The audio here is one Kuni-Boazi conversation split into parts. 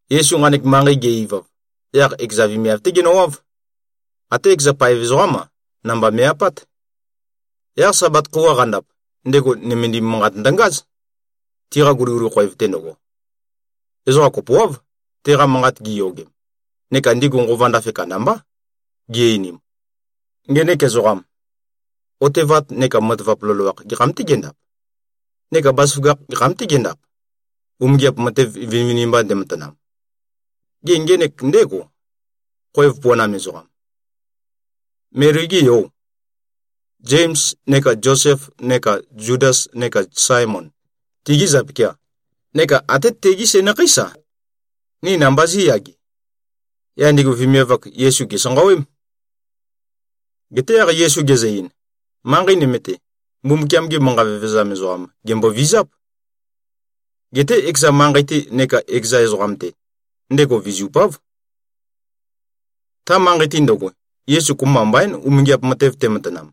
Yesu nqanek manqei ge-ivav, yaq ekeza vemiav-té genøwáv. Até ekeza paev ezoqám-a, namba me꞉-apát. Yaq Sabat khøuwa qandap, ndego nømendim manqat ndøngáz, tiqa guliguli khoev-te ndøgo. Ezoqa kopoáv, teqa manqat giyogem. Neka ndigu nqova ndafe kandambá, gi-einim, “Ngenek ezoqam, otevat neka matavap loloakh gekham-tê gendap? Neka bazaføgakh gekham-tê gendap, umingiap matev vinivinimba ndematanam? Gê, ngenek ndégò, khoev puanam ezoqam? Meli-gê yò? Zems neka Zosef neka Zudas neka Saemon, tigî zapikià? Neka até tegí sænakheís-a, ni namba zí꞉yage?” Yaq ndigu vemiav-ak, Yesu gèsanqawém. Geté yaq Yesu gezø-ein, “Manqei nøme-te, Mbumbukiam-ge manqa vevezam ezoqam, gèmbovizáp. Geté ekeza manqei-te neka ekeza ezoqam-te, ndego vizupáv.” Ta manqei-te ndøgo, Yesu kopømba mbaín, umingiap matev tematanam.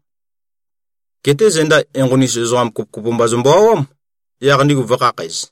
Geté zenda enqoni-us ezoqa kopokopo mba zømbø-awám, yaq ndigu vø̄khakhæz.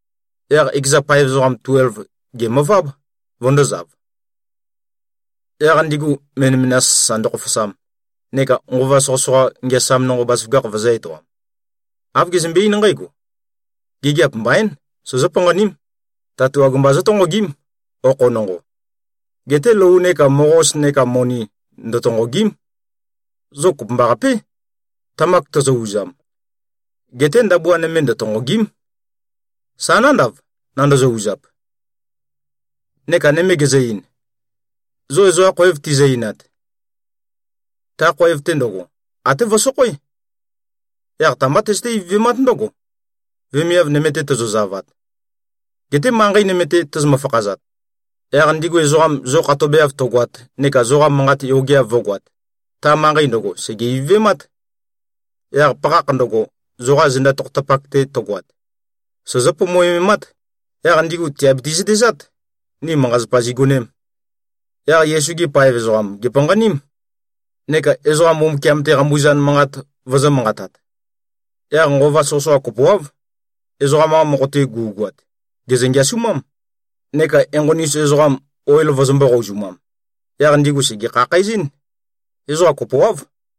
Yaq ekeza paev ezoqa tuelv gèmøváb, vøndōzav, yaq ndigu menømenas sasa ndøkhofosam, neka nqova soqøsoqa ngeasam nonqo bazaføgakh vøzø̄-etoam. Āv gezømbe-eín nqǽgo, “Gigiap mbaín, sozó-panqaním. Tatuag mba zótonqogím, okho nonqo. Geté lou neka moqos neka moni ndøtonqògi᷄m. Zo kopømbaqapé, tamak tozo-uzam. Geté ndabua nøme ndøtonqògi᷄m, sa nándav, nandozo-uzap.” Neka nøme gezø-ein, “Zo ezoqa khoev tizø-einat, ta khoev-te ndøgo, até vøsokhoé. Yaq ta-mbá tøzøté-ivøvemát ndǿgo, vemiav nøme-te tozozavat. Geté manqei nøme-te tozomø-fakhazat, yaq ndigu ezoqam zo khatobeav tøgoat neka zoqa manqat yogeav vǿgoāt, ta manqei ndøgo sège-ivøvemát. Yaq pakhakh ndøgo, zoqa zenda tokhotapak-te tøgoat, sozó-pomoememát. Yaq ndigu tìabiti-zøtezát, ni manqa-zapa zigonēm.” Yaq Yesu-gi paev ezoqam gèpanqaním, neka ezoqa Mbumbukiam-te qambuzan manqat vøzø̄-manqatat. Yaq nqova soqøsoqa kopoáv, ezoqam-qa mokho-te gu꞉goat, gèzø-ngeasumám. Neka enqoni-us ezoqam, oil vøzømbō-qouzumam. Yaq ndigu sège-khakhæzɨ́n. Ezoqa kopoáv.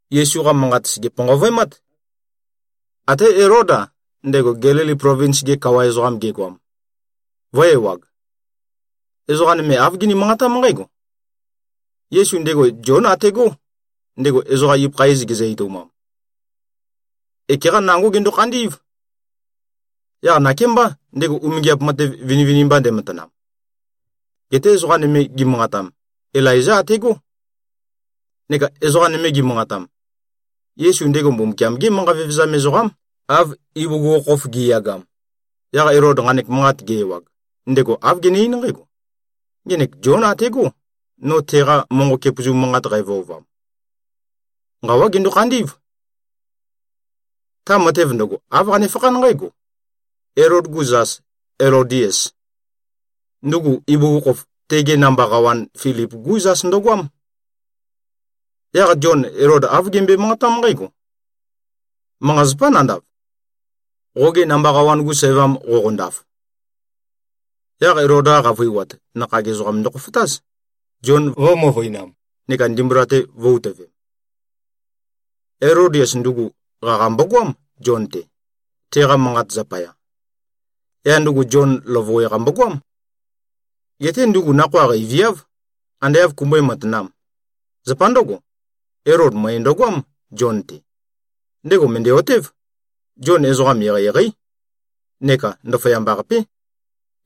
Yesu-qa manqat sège-panqavøemát. Até Elód-a, ndego Gelili plovins-ge kawa ezoqam gegoam, vø̄-ewag. Ezoqa nøme āv gini-manqatám nqǽgo, “Yesu, ndego Zión ategó, ndego ezoqam ibøkha iz gezø-etoumam. Ekeqa nangó gendo-khandí꞉v. Yaq nakémbá, ndego umingiap matev vinivinimba ndematanam.” Geté ezoqa nøme gimanqatam, “Ilaizá ategó.” Neka ezoqa nøme gimanqatam, “Yesu ndego Mbumbukiam-gé manqa vevezam ezoqám, av ibugukhokhof gi꞉yagam.” Yaq Elod nqanek manqat ge-ewag, ndego āv gene-eín nqǽgo, “Ngenek Zión ategó, no teqa monqo kepøzu manqat qævøovam. Nqawá gendo-khandí꞉v.” Ta matev ndøgo, āv qanefakhán nqǽgo: Elod-gu zas Elodias, ndugu ibugukhokhof tege namba qawan Filip-gú zas ndøgoám. Yaq Zion Elod āv gembøe-manqatám nqǽgo, “Manqa-zapá nandav, qoge namba qawan-gu sævam qoqondaf.” Yaq Elod-qa qavøiwat, nakhag ezoqam ndøkhofotáz, Zion vø̄-møvøinam neka ndimbula-te vø̄-utøvem. Elodias ndugu, qaqa mbogoám, Zion-te, teqa manqat zapaya. Yaq ndugu Zion løvøwe-qa mbogoám. Geté ndugu nakhoa qeiviáv, ande āv kumbøé-matanām. Zapa ndǿgo, Elod møe ndøgoám, Zion-te. Ndego mø̀ndæ-otév, Zion ezoqam eqeieqeí neka ndaføyamba-qapé.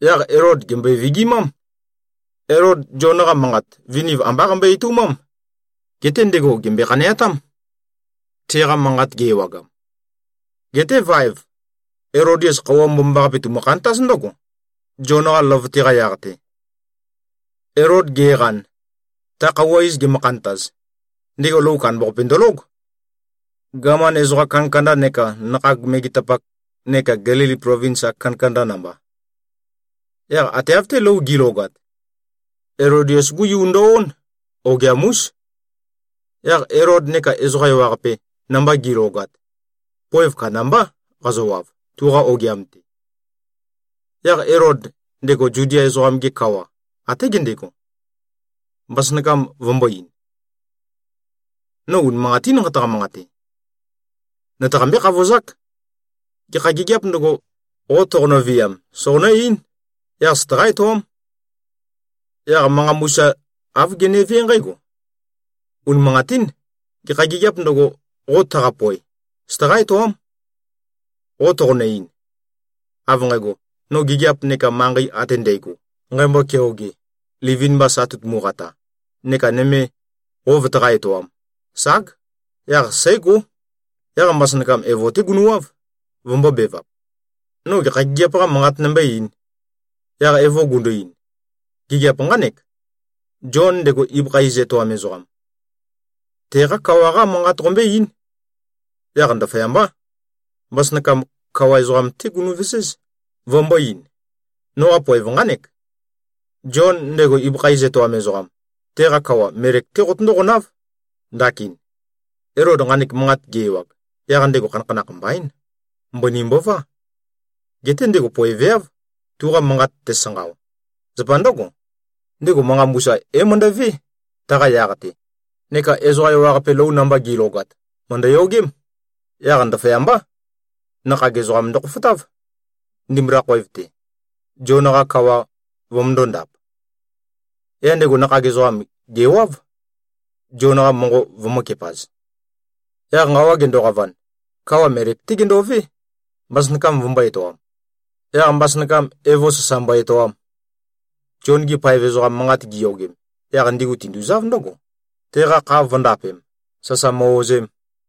Yaq Elod gèmbøe-vigimám. Elod, Zion-qa manqat, viniv ambá qambøe-etoumám. Geté ndego gèmbøe-khaneatám, teqa manqat ge-ewagam. Geté vaev, Elodias khøuwa mbomambaqape tumø-khantáz ndǿgo, Zion-qa løvøte-qa yaq-te. Elod ge꞉qan, ta khøuwa iz gemø-khantaz, ndego lou kandambaqape ndølóg, gaman ezoqam kandakanda neka nakhag megetapak neka Gelili plovins-ak kandakanda namba. Yaq ate av-té lou gi꞉logat, Elodias-gú yu ndo-ón, ogiam-ús. Yaq Elod neka ezoqa ewaqape, namba gi꞉logat, poev kandambá qazøwav, tuqa ogiam-te. Yaq Elod, ndego Zudia ezoqam-ge kawa, até gendego, mbasønakam vømbō-ein, “No unimanqatín nqataqa-manqate. Nøtaqambé-khavozák. Gekha gigiāp ndøgo, qo toqonø-viam, soqonǿ-eín. Yaq søtaqá-etoám.” Yaq manqa mbusa āv genevé nqǽgo, “Unimanqatín. Gekha gigiāp ndøgo, qo taqapoe. Søtaqá-etoám. Qo toqonø-ein, av nqægo, no gigiap neka manqei ate ndægo, nqæmbo-keoge, livin-mba sa tøtumu-qata, neka nøme qo vøtaqá-etoām, ság. Yaq sǽgó.” Yaq mbasønakam evo-té gunøwáv, vømbōbevap, “No gekha gigiap-qa manqat nombó-eīn?” Yaq evo gundu-ein, “Gigiap nqánek: Zion, ndego ibøkha iz etoam ezoqam, teqá kawa-qá manqat qombøé-eín.” Yaq ndaføyambá, mbasønakam kawa ezoqam-té gunøveséz, vømbō-ein, “Noqa poev nqánek. Zion, ndego ibøkha iz etoam ezoqam, teqa kawa melek-té qotøndó-qonáv, ndakin.” Elod nqanek manqat ge-ewag, yaq ndego khanakhanakh mbaín. Mbøni mbová. Geté ndego poeveáv, tuqa manqat tesanqao. Zapa ndǿgo, ndego manqa mbusa é-møndo꞉vé, taqa yaq-te, neka ezoqa ewaqape lou namba gi꞉logat, mø̀ndøyogém. Yaq ndaføyambá, nakhag ezoqam ndøkhofotáv, ndimbula khoev-te, Zion-qa kawa vømøndó-ndāp. Yaq ndego nakhag ezoqam gèwáv, Zion-qa monqo vømø̄kepaz. Yaq nqawa gendoqavan, kawa melek-té gendové, mbasønakam vømbō-etoam. Yaq mbasønakam evo sasa mbo-etoam. Zion-gi paev ezoqam manqat giyogem, yaq ndigu tinduzáv ndǿgo, teqa kha vø̄ndapem, sasa mø-ozem.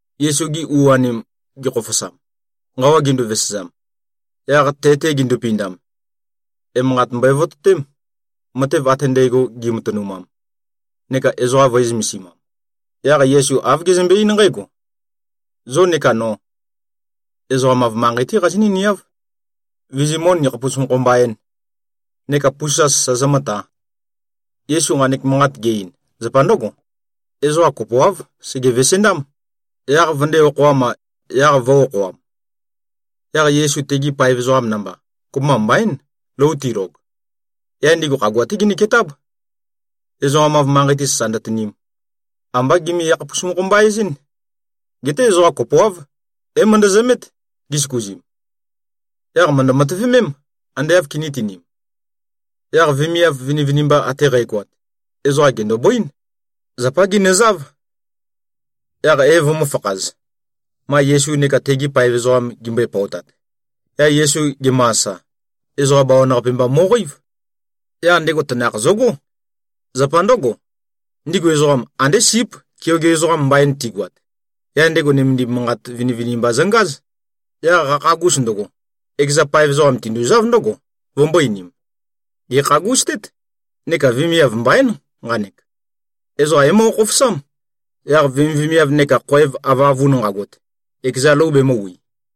Yesu-gi u-anim, gekhofosam, nqawa gindu-vesezam, yaq te-te gindupindam, emanqat mbøe-vototém, matev ate ndægo gi꞉matønumam neka ezoqa vø̄e-zømesimam. Yaq Yesu āv gezømbe-eín nqǽgo, “Zo neka no, ezoqam-av manqei-té qazinǿ-niáv, vizimǿ-nikhapus-mokho-mba-ēn, neka pusa sasa zomǿtā.” Yesu nqanek manqat ge-ein, zapa ndǿgo. Ezoqa kopoáv, sege-vesendám, yaq vøndē-okhoam-a, yaq vø̄-okhoam. Yaq Yesu tegi paev ezoqam namba, kopømba mbaín, lou tilog. Yaq ndigu khagua-té ginøketáb, ezoqam-av manqei-te sasa ndøtinim. Ambá gimi-yakhapus-mokho-mba-ezín. Geté ezoqa kopoáv, é-møndøzømét, gisøkuzim. Yaq mø̀ndø-matøvemém, ande āv kinítinīm. Yaq vemiav vinivinimba ate qægoat, ezoqa gèndobøín. Zapá ginøzáv. Yaq é-vømø̄fakhaz, ma Yesu neka tegi paev ezoqam gimbøe-pøotat. Yaq Yesu gemø-asa, ezoqa bawan-qape mba mo꞉qeív. Yaq ndego tanakh zøgó. Zapa ndǿgo, ndigu ezoqam, andé síp, keoge ezoqam mbain tigøat. Yaq ndego nømendim manqat vinivinimba zøngáz. Yaq qakhagus ndøgo, ekeza paev ezoqam tinduzáv ndǿgo, vømbō-einim, “Gèkhagustét, neka vemiav mbaín, nqanek. Ezoqam é-moqo-khofosám. Yaq vemivemiav neka khoev avøavun nqagot, ekeza lou bemø̄wi.”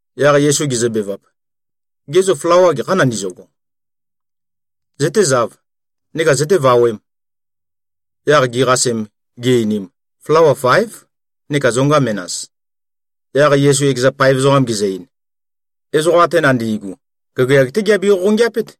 Yaq Yesu gezøbevap, “Gê, zo flawa gekhâ nandizøgo? Zøtézāv, neka zøtévawēm.” Yaq giqasem, gi-einim, “Flawa faév, neka zonga menas.” Yaq Yesu ekeza paev ezoqam gezø-ein, “Ezoqa ate nandi꞉gu, gagayag-té giabe-qoqongeapét.”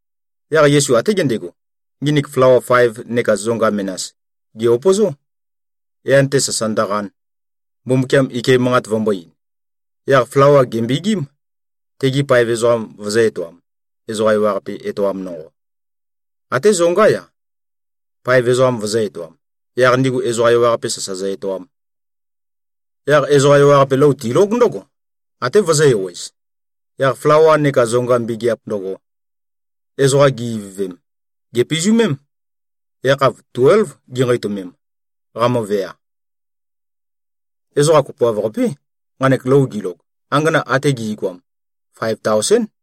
Yaq Yesu até gendego, nginik flawa faev neka zonga menas gè-upøzó, yan-te sasa ndøqan, Mbumbukiam ike manqat vømbō-ein. Yaq flawa gèmbegím, tegi paev ezoqam vøzø̄-etoam, ezoqa ewaqape-te etoam nonqo. Até zongá-ya, paev ezoqam vøzø̄-etoam, yaq ndigu ezoqa ewaqape sasa zø-etoam. Yaq ezoqa ewaqape, lou tilóg ndǿgo, até vøzø̄-ewez. Yaq flawa neka zonga mbegeap ndøgo, ezoqa gi-ivøvem, gèpizumém. Yakhav tuélv ginqeitømem, qamøvea. Ezoqa kopoav-qapé, nqanek lou gilog. Angana ate gi꞉goam, faev taosén.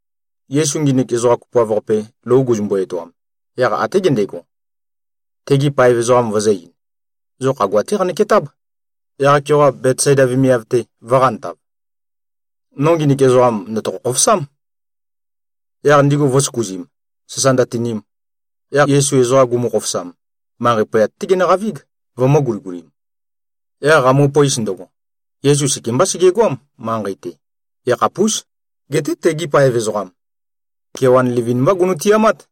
Yesu nginik ezoqa kopoav-qape, lou guzumbu-etoam, yaq até gendego, tegi paev ezoqam vøzø̄-ein, “Zo khagua-té qanøketáb, yaq-keoqa, Betsaida vemiav-te, vō꞉qantav. No nginik ezoqam ndø̀tokho-khofosám.” Yaq ndigu vø̄søkuzim, sasa ndøtinim. Yaq Yesu ezoqa gumu-khofosam, manqei poyat-té genøqavíg, vømø̄-guligulim. Yaq qamupøis ndøgo, Yesu sekembá segegoám, manqei-te. Ekhapús. Geté tegi paev ezoqam, kewan livin-mbá gunu-tiamát.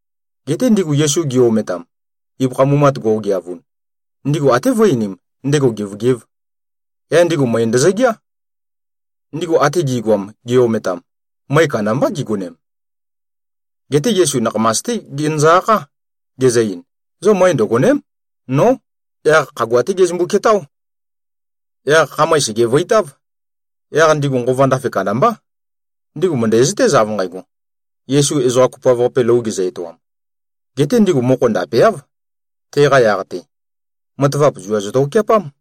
Geté ndigu Yesu gi-ometam, ibøkha mumat go꞉geavun, ndigu até vø̄e-einim, ndego gevøgēv. Yaq ndigu møe ndøzøgeá. Ndigu ate gi꞉goam, gi-ometam, møe kandambá gigonem. Geté Yesu nakhamas-té genøzø-akhá, gezø-ein, “Zo møe ndøgòne᷄m. Nó!” Yaq khagua-té gezømbu-ketáo. Yaq khamøe sègevøitáv. Yaq ndigu nqova ndafe kandambá. Ndigu mø̀ndæzøtéz, av nqægo, Yesu ezoqa kopoav-qape lou gezø-etoam. Geté ndigu mokho ndapeáv, teqa yaq-te. Matavap zua zøtokeapám.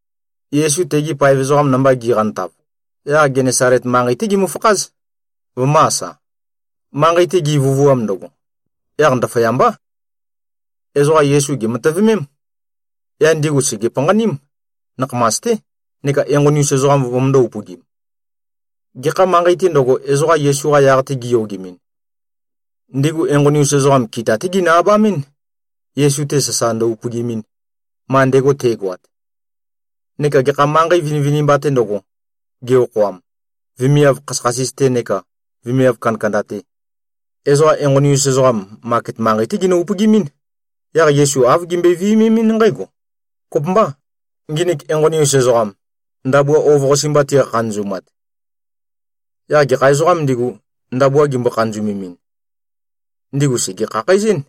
Yesu tegi paev ezoqam namba giqantav, yaq Genesalet manqei-té gimøfakház, vømø̄-asa. Manqei-te givøvuam ndøgo, yaq ndaføyambá, ezoqa Yesu gèmatøvømém. Yaq ndigu sège-panqaním, nakhamas-té, neka enqoni-us ezoqam vømøndō-upøgim. Gekha manqei-tē ndøgo, ezoqa Yesu-qa yaq-te giyogemɨn, ndigu enqoni-us ezoqam kita-té ginø-abamín, Yesu-te sasa ndø-upøgimin, ma ndego te꞉goat. Neka gekha manqei vinivinimba-tē ndøgo, ge-okhoam, vemiav khasøkhasis-te neka vemiav kandakanda-te, ezoqa enqoni-us ezoqam, maket manqei-té ginø-upøgimín. Yaq Yesu āv gimbøe-viømemɨ́n nqǽgo, “Kopømbâ, nginik enqoni-us ezoqam, ndabua ov-qase mba tiqa-khanøzumat.” Yaq gekha ezoqām ndigu, ndabua gimbo-khanøzemin, ndigu sège-khakhæzɨ́n.